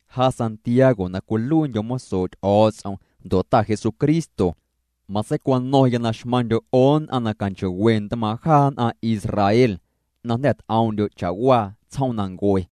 Ja Santiago na cwiluiindyo̱ mosoo' Ty'o̱o̱ts'om ndo' Ta Jesucristo. Matseicwano̱ⁿya na xmaⁿndyo' 'o nn'aⁿ na canchoo'we ntmaaⁿ' jaa nn'aⁿ Israel na jnda̱ t'oom'ndyo' cha'waa tsjoomnancue.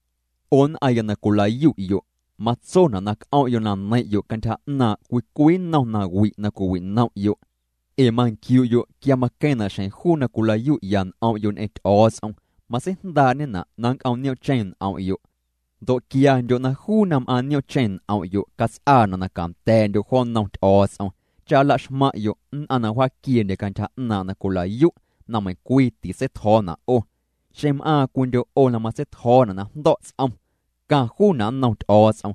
'O nn'aⁿya na cwila'yu'yo', matsona' na c'om'yo' na neiⁿ'yo' cantyja 'naaⁿ' cwii cwii nnom nawi' na cwiwinom'yo'. Ee manquiu'yo' quia maqueⁿna' xjeⁿ juu na cwila'yu'ya n'om'yo' ñ'eⁿ Ty'o̱o̱ts'om, matseijndaa'ñena' na nnc'om' niom'cheⁿ n'om'yo'. Ndo' quiandyo' na juu na m'aaⁿ niomcheⁿ n'om'yo', cats'aana' na canda̱a̱'ndyo' jo nnom Ty'o̱o̱ts'om cha nla'xmaⁿ'yo' nn'aⁿ na wjaaquieendye cantyja na cwila'yu' na meiⁿncwii titseitjo̱o̱na' 'o. Xeⁿ m'aaⁿ cwiindyo' 'o na matseitjo̱o̱na' na jndo̱' ts'om, caⁿ juuna' nnom Ty'o̱o̱ts'om,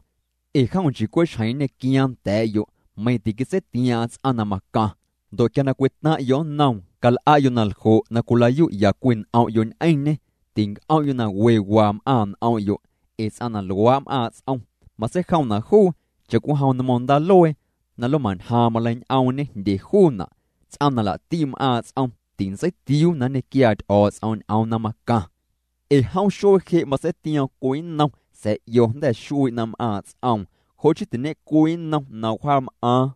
ee jom nchii cwe' xjeⁿ nñequiaaⁿ nda̱a̱'yo' meiⁿ tiquitseitiaaⁿ'aⁿ ts'aⁿ na macaⁿ. Ndo' quia cwitaⁿ'yo' nnoom, cal'a'yo' naljo' na cwila'yu'ya cwii n'om'yo' ñ'eⁿñê tinc'om'yo' na we waa m'aaⁿ' n'om'yo', ee ts'aⁿ na luaa' m'aaⁿ' ts'om, matseijomna' juu cha'cwijom nmo̱ⁿ ndaaluee, na lomañjaaⁿ maleiñ'oomñe jndye juuna'. Ts'aⁿ na laa'ti' m'aaⁿ' ts'om tintseitiuu na nñequiaa Ty'o̱o̱ts'om ñ'oom na macaⁿ. Ee jom xuee je' matseitioom cwii nnom, sa̱a̱ 'io jnda̱ xuii' na m'aaⁿ' ts'oom, jo' chii tiñe'cwii nnom na wjaam'aaⁿ.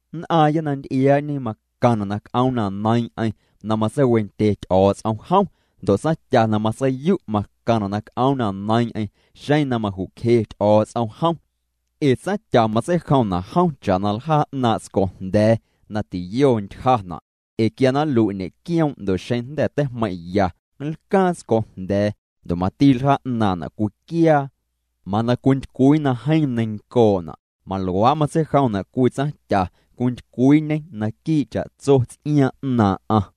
Nn'aaⁿya na nty'iaa'ñe macaⁿna' na c'oom na neiiⁿ'eⁿ na matseiwendye Ty'o̱o̱ts'om jom. Ndo' tsaⁿtya na matseiyu' macaⁿna' na c'oom na neiiⁿ'eⁿ xeⁿ na maju'cje Ty'o̱o̱ts'om jom. Ee tsaⁿtya matseijomna' jom cha'na ljaa' 'naaⁿ' tscojnda̱a̱ na tiyo ntyjana'. Ee quia na nlui' ñe'quioom' ndo' xeⁿ jnda̱ teijmeiⁿ'ya, nlcaaⁿ tscojnda̱a̱ ndo' mati ljaa' 'naaⁿ'na' cwiquiaa, mana cwintycwii na jeeⁿ neiⁿncoo'na'. Maluaa' matseijomna' cwii tsaⁿtya, cwintycwiiñê naquii' cha'tso ts'iaaⁿ 'naaⁿ'aⁿ.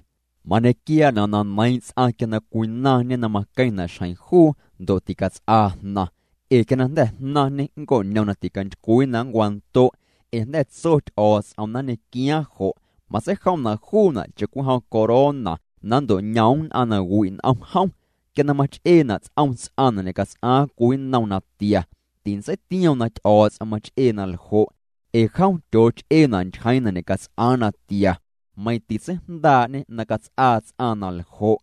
Mañequiaana' na neiiⁿ' ts'aⁿ quia na cwinaⁿñe na maqueⁿna' xjeⁿ juu ndo' ticats'aa jnaⁿ. Ee quia na jnda̱ jnaⁿñe nnco'ñom na ticantycwii na nncwando' ee jnda̱ tso Ty'o̱o̱ts'om na nñequiaaⁿ jo'. Matseijomna' juuna' cha'cwijom corona na nnto'ñoom nn'aⁿ na wi' n'om jom. Quia na mach'eena' ts'om ts'aⁿ na ñe'cats'aaⁿ cwii nnom natia, tintseitioom na Ty'o̱o̱ts'om mach'ee na ljo' ee jom tyooch'eena' ntyjeeⁿ na ñe'cats'aaⁿ natia, meiⁿ titseijndaa'ñê na cats'aa ts'aⁿ naljo'.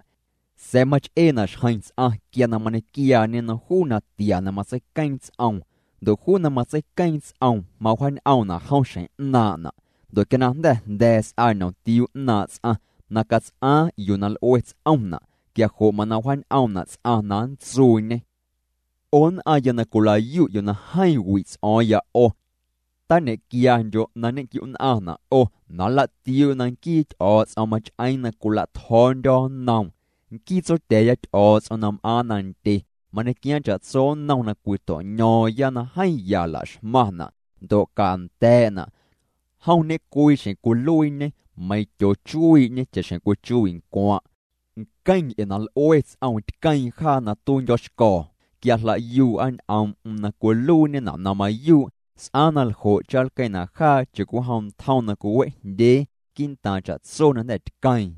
Sa̱a̱ mach'eena' xjeⁿ ts'aⁿ quia na mañequiaañê nnom juu natia na matseiqueeⁿ ts'oom, ndo' juu na matseiqueeⁿ ts'oom mawjaañ'oomna' jom xjeⁿ 'naaⁿ'na'. Ndo' quia na jnda̱ jnda̱a̱ s'aa ñ'omtiuu 'ñaaⁿ' ts'aⁿ na cats'aaⁿ yuu na l'ue ts'omna', quia jo' mana wjaañ'oomna' ts'aⁿ na nntsuuñê. 'O nn'aⁿya na cwila'yu'yo' na jeeⁿ wi' ts'o̱o̱ⁿya 'o, tañequiandyo' na nñequiu'nn'aⁿna' 'o na nla'tiuu'yo' na nquii Ty'o̱o̱ts'om mach'eeⁿ na cwila'tjo̱o̱ndyo̱ nnoom. Nquii Tsotya̱a̱ya Ty'o̱o̱ts'om na m'aaⁿ nandye mañequiaaⁿ cha'tso nnom na cwito'ño̱o̱ⁿya na jeeⁿ ya laxmaⁿna' ndo' canda̱a̱'na'. Jom ñecwii xjeⁿ cwiluiiñê, meiⁿ tyootseichuii'ñê cha'xjeⁿ cwichuii' ncwaⁿ'. Nqueⁿ nc'e na l'ue ts'oom, tqueeⁿ jaa na tuiindyo̱xco̱o̱ quia jla'yuu'a ñ'oom'm na cwiluiiñena' na mayuu'. S'aaⁿ na ljo' cha nlqueⁿna' jaa cha'cwijom ntjom na cwiwe'jndyee quii'ntaaⁿ cha'tso na jnda̱ tqueeⁿ.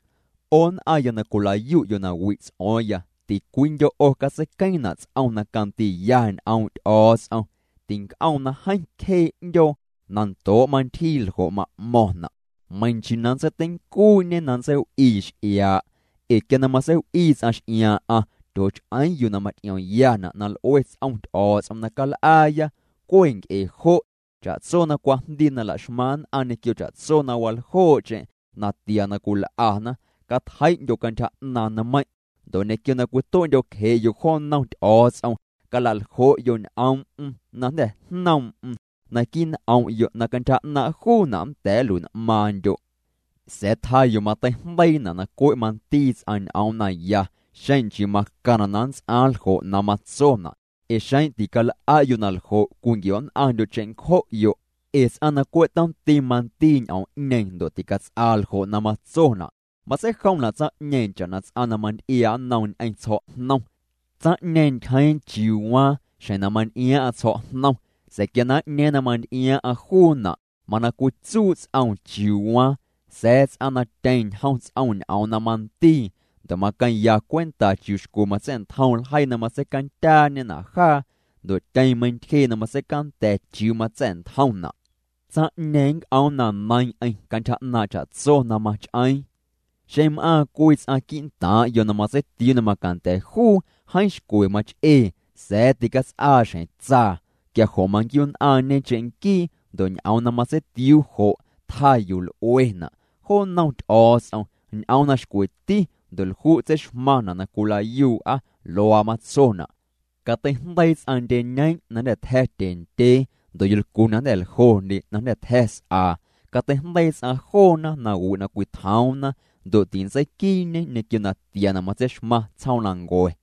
'O nn'aⁿya na cwila'yu'yo' na wi' ts'o̱o̱ⁿya, ticwiindyo' 'o catseiqueeⁿna' ts'om na candiiya ñ'oom' Ty'o̱o̱ts'om. Tinc'oom na jeeⁿ cjee 'ndyoo na ndoo' mantyjii ljo' ma'mo̱ⁿna'. Meiⁿ nchii na nntseiteincuu'ñe na nntseiw'ii x'iaa'. Ee quia na matseiw'ii ts'aⁿ x'iaaⁿ'aⁿ, tyooch'eeⁿ yuu na maty'iomyana' na l'ue ts'om Ty'o̱o̱ts'om na cal'aaya. Cwe' nc'e jo', cha'tso na cwajndii na la'xmaⁿ nn'aⁿ ñequio cha'tso na waljoo'cheⁿ na tia na cwil'ana, catjei'ndyo' cantyja 'naaⁿ nmeiⁿ'. Ndo' ñequio na cwitue'ndyo'cje'yo' jo nnom Ty'o̱o̱ts'om, cala'ljo'yo' ñ'oom'm na jnda̱ jnoom'm naquii' n'om'yo', na cantyja 'naaⁿ' juuna' nnda̱a̱ nluin'maaⁿndyo'. Sa̱a̱ tjaa yuu mateijndeiina' na cwe' mandii ts'aⁿ ñ'oom naya, xeⁿ nchii macaⁿna' na nnts'aaⁿ ljo' na matsona', ee xeⁿ tical'a'yo' naljo' cwinquio'nn'aⁿndyo' cheⁿncjo'yo'. Ee ts'aⁿ na cwe' tomti mandii ñ'oom'ñeeⁿ ndo' ticats'aa ljo' na matsona' matseijomna' tsaⁿ'ñeeⁿ cha'na ts'aⁿ na manty'iaa' nnom ñ'eⁿ tsjo̱'jnom. Tsaⁿ'ñeeⁿ ntyjeeⁿ chiuu waaⁿ xjeⁿ na manty'iaaⁿ'aⁿ tsjo̱'jnom, sa̱a̱ quia na n'ñeeⁿ na manty'iaaⁿ'aⁿ juuna' mana cwitsuu' ts'oom chiuu waaⁿ. Sa̱a̱ tsaⁿ na tyeⁿ ñjom ts'om ñ'oom na mandii, ndo' maqueⁿya cwenta chiuu xcwe matsa̱'ntjom ljeii na matseicandyaañena' jaa ndo' tyeⁿ meiⁿntyjee' na matseicanda̱ chiuu matsa̱'ntjomna', tsaⁿ'ñeeⁿ nnc'oom na neiiⁿ'eⁿ cantyja 'naaⁿ' cha'tso na mach'eeⁿ. Xeⁿ m'aaⁿ cwii ts'aⁿ quii'ntaaⁿ'yo' na matseitiuu na macanda̱ juu jeeⁿ xcwe mach'ee sa̱a̱ ticats'aa xjeⁿ tsaa, quia jo' manquiu'nn'aⁿñe cheⁿnquii, ndo' ñ'oom na matseitiuu jo' tjaa yuu l'uena'. Jo nnom Ty'o̱o̱ts'om, ñ'oom na xcweti ndo' lju' tseixmaⁿ na cwila'yuu'a, luaa matsona': Cateijndeii ts'aⁿ ndyeñeeⁿ' na jnda̱ tja̱ tyendyee, ndo' yolcu na jnda̱ ljondye na tja̱ s'aa, cateijndeii ts'aⁿ joona nawi' na cwitjoomna ndo' tintseiquii'ñe ñequio natia na matseixmaⁿ tsjoomnancue.